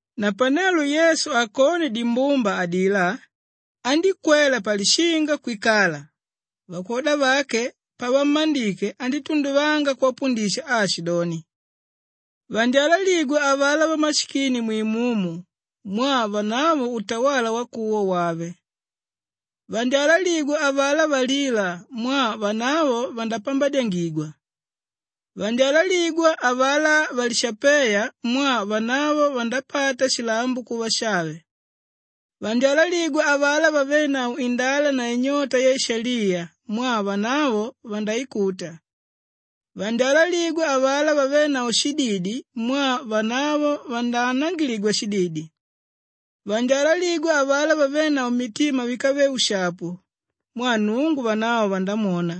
Napanelo Yesu akone dimbumba adilá, andíkwela palishinga kwikala. Vakwoda vake pavammandike, andítunduvanga kuvapundisha aashidoni, “Vandyalaligwa avalá vamashikini mwimumu, mwaa vanavo utawala wakuwa wàve. Vandyalaligwa avalá valíla, mwaa vanavo vandapambadyangigwa. Vandyalaligwa avalá valishapéya, mwaa vanavo vandapata shilambo kuva shave. Vandyalaligwa avalá vavénavo indala na inyota yaishaliya, mwaa vanavo vandaikuta. Vandyalaligwa avalá vavénavo shididi, mwaa vanavo vandaanangiligwa shididi. Vandyalaligwa avalá vavénavo mitima víkave ushapu, mwaa Nnungu, vanavo vandamwona.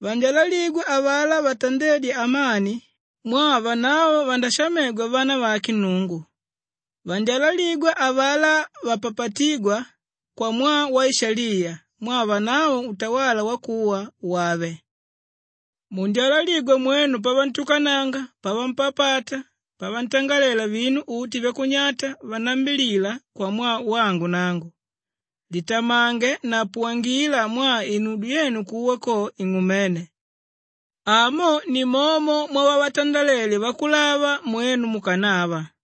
Vandyalaligwa avalá vatandédya amani, mwaa vanavo vandashamegwa vana vake Nnungu. Vandyalaligwa avalá vapapatígwa kwamwaa waishaliya, mwaa vanavo utawala wakuwa wàve. “Mundyalaligwa mwenu pavantukananga, pavampapata, pavantangalela vinu uti vyakunyata, vanambilila kwamwaa wangu nangu. Litamange na puwangila mwaa inudyo yenu kuwa ko ing'umene. Amo nimomo mwavavatandalele vakulava mwenu mukanava.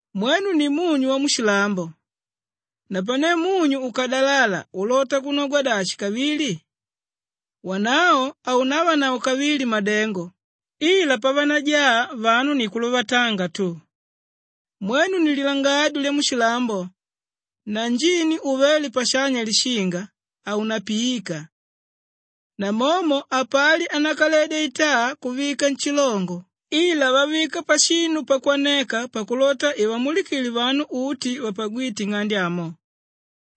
“Mwenu ni munyu wamushilambo, napane munyu ukadalala ulota kunogwa dashi kavili? Wanavo haunavanavo kavili madengo ila pavanajaa vanu ni kuluvatanga tu. Mwenu ni lilangadyo lyamushilambo na njini uvéle pashanya lishinga, haunapiika. Namomo hapali ánakaledya itaa kuvika nshilongo ila vavika pashinu pakwaneka pakulota ivamulikile vanu uti vapagwíte nng'ande amo.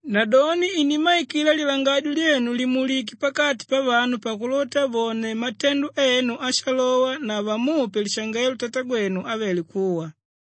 Nadoni inimmaikila lilangadyo lyenu limulike pakati pavanu pakulota vone matendo enu ashalowa na vamupe lishangelo Tatagwenu ávele kuwa.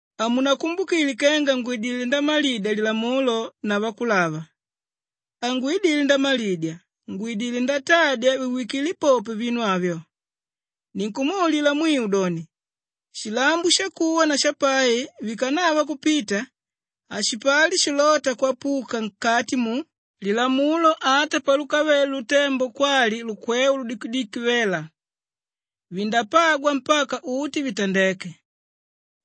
“Hamunakumbukile kenga ngwidilé ndamalidya Lilamulo na Vakulava. Hangwidile ndamalidya, ngwidilé ndatadya viwikile popo vinu avyo. Ninkumwaulila mwiu doni, shilambo shakuwa na shapai vikanava kupita, hashipali shilóta kwapuka nkati mu Lilamulo ata palukavéle lutembo kwali lukweu ludikidiki vela, vindapagwa mpaka uti vitandeke.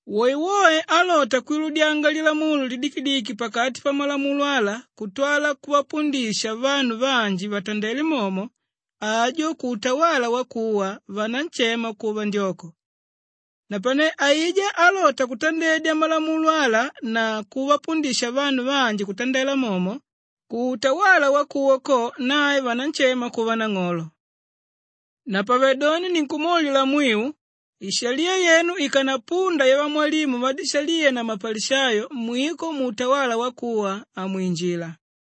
Woewoe álota kwiludyanga lilamulo lidikidiki pakati pamalamulo ala kutwala kuvapundisha vanu vanji vatandele momo, ajo kuutawala wakuwa, vananshema kuva ndyoko. Napane aijá álota kutandedya malamulo ala na kuvapundisha vanu vanji kutandela momo, kuutwala wakuwa ko, nae vananshema kuva nang'olo. Napavedoni ninkumwaulila mwiu, ishaliya yenu ikanapunda yavamwalimu vadishaliya na mapalishayo, mwiko muutawala wakuwa hamwinjila.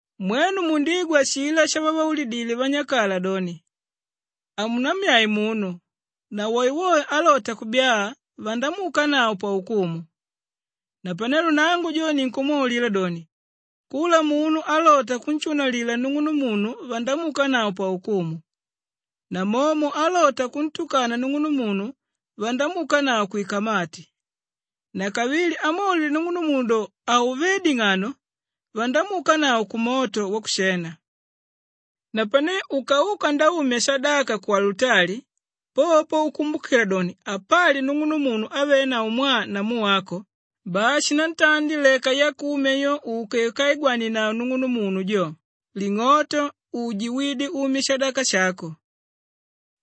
“Mwenu mundigwa ashilá shavavaulidile vanyakala doni, ‘Haunammyae munu na woewoe álota kubyaa, vandamuukanavo paukumu.’ Napane nangu jo ninkumwaulila doni, kula munu álota kunshunalila nung'unumunu vandamuukanavo paukumu. Namomo álota kuntukana nung'unumunu, vandamuukanavo kwikamati, nakavili, ámwaulila nung'unumunu do, ‘Hauvé ding'ano!’ vandamuukanavo kumoto wakushena. Napane ukauka ndaumya shadaka ku alutali, popo ukumbukila doni, apali nung'unumunu ávenavo mwaa namu wako, bai shinantandi leka yakumya yo uke ukaigwanenavo nung'unumunu jo, ling'oto uje wide umye shadaka shako.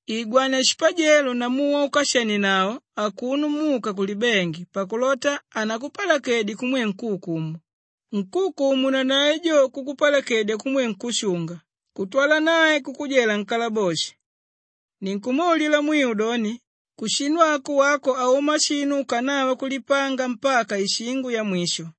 Igwania shipajelo namu waukashenienavo akuno muka kulibengi pakulota hanakupalakedye kumwe nkúukumu, nkúukumu nanae jo kukupalakedya kumwe nkúshunga kutwala nae kukujela nkalaboshi. Ninkukwaulila mwiu doni, kushinu ako wako hauma shinu ukanava kulipanga mpaka ishingo yamwisho.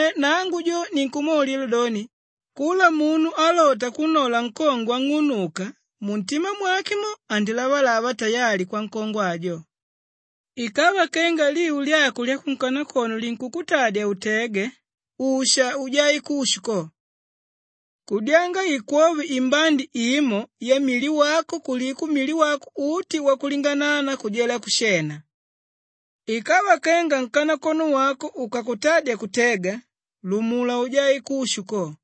Napane nangu jo ninkumwaulila doni, kula munu álota kunnola nkongwe ang'unuka, muntima mwake mo, andilavalava tayali kwankongwe ajo. Ikava kenga liu lyako lyakunkanakono linkukutadya utege, usha ujae kushu ko. Kudyanga ikwove imbandi imo yamili wako kuliko mili wako uti wakulinganana kujela kushena. Ikava kenga nkanakono wako ukakutadya kutega, lumula ujae kushu ko.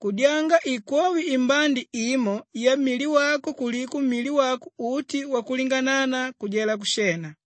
Kudyanga ikwove imbandi imo yamili wako kuliko mili wako uti wakulinganana kujela kushena.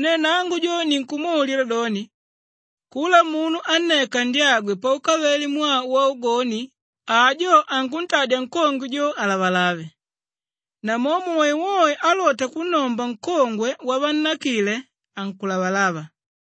Napane nangu jo, ninkumwaulila doni, kula munu ánneka ndyagwe paukavele mwaa waugoni, ajo ankuntadya nkongwe jo alavalave. Namomo woewoe álota kunnomba nkongwe wavannakile, ankulavalava.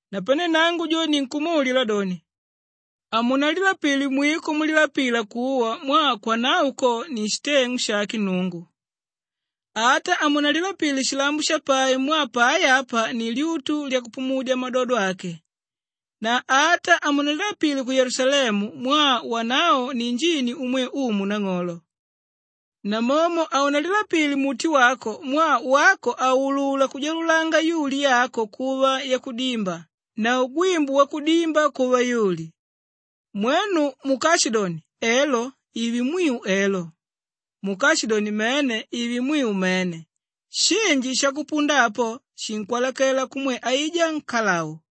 Napane nangu jo ninkumwaulila doni, hamunalilapile mwiko, mulilapila kuwa mwaa kwanavo ko ni shiteng'u shake Nnungu, ata hamunalilapile shilambo shapai mwaa pai apa ni lyutu lyakupumudya madodo ake, na ata hamunalilapile ku Yelusalemu mwaa wanavo ni njini umwe Umu Nang'olo. Namomo haunalilapile muti wako mwaa wako hauulula kujalulanga yuli yako kuva yakudimba na ugwimbu wakudimba kuva yuli. Mwenu mukashidoni, ‘Elo’ ive mwiu elo, mukashidoni ‘Mene’ ive mwiu mene. Shinji shakupunda apo, shinkwalakela kumwe aijá nkalau.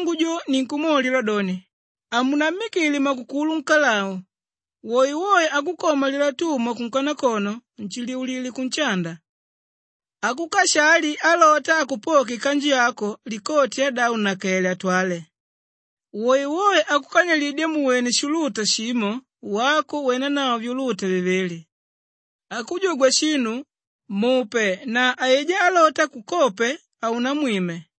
Napane nangu jo ninkumwaulila doni, hamunammikile makukulu nkalau. Woewoe ákukoma lilatuma kunkanakono, nshiliulile kunshanda. Ákukashali alota akupoke ikanju yako, likoti yadavo nnakele atwale. Woewoe ákukanyilidya muwene shuuluta shimo, wako wenanavo vyuluta vivili. Ákujugwa shinu, mupe na aijá álota akukope, haunamwime.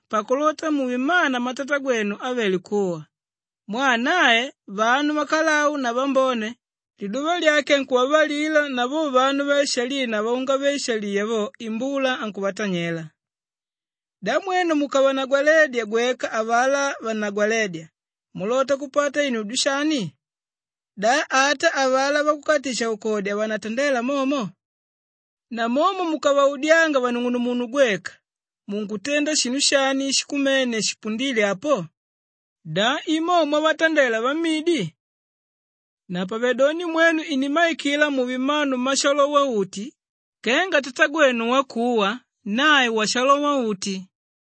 pakulota muve mmana mmatatagwenu ávele kuwa. Mwaa nae vanu vakalau na vambone, liduva lyake ankuvavalila na vo vanu vaishaliya na vaungave-ishaliya vo, imbula ankuvatanyela. Da mwenu mukavanagwaledya gweka avalá vannagwalédya mulota kupata inudyo shani? Da ata avalá vakukatisha-ukodi havanatandela momo? Namomo mukavaudyanga vanung'unumunu gweka, munkutenda shinu shani shikumene shipundíle apo? Da i mo mwavatandela vamidi? Napavedoni mwenu inimmaikila muve mmanu mmashalowa-uti kenga Tatagwenu wakuwa, nae washalowa-uti.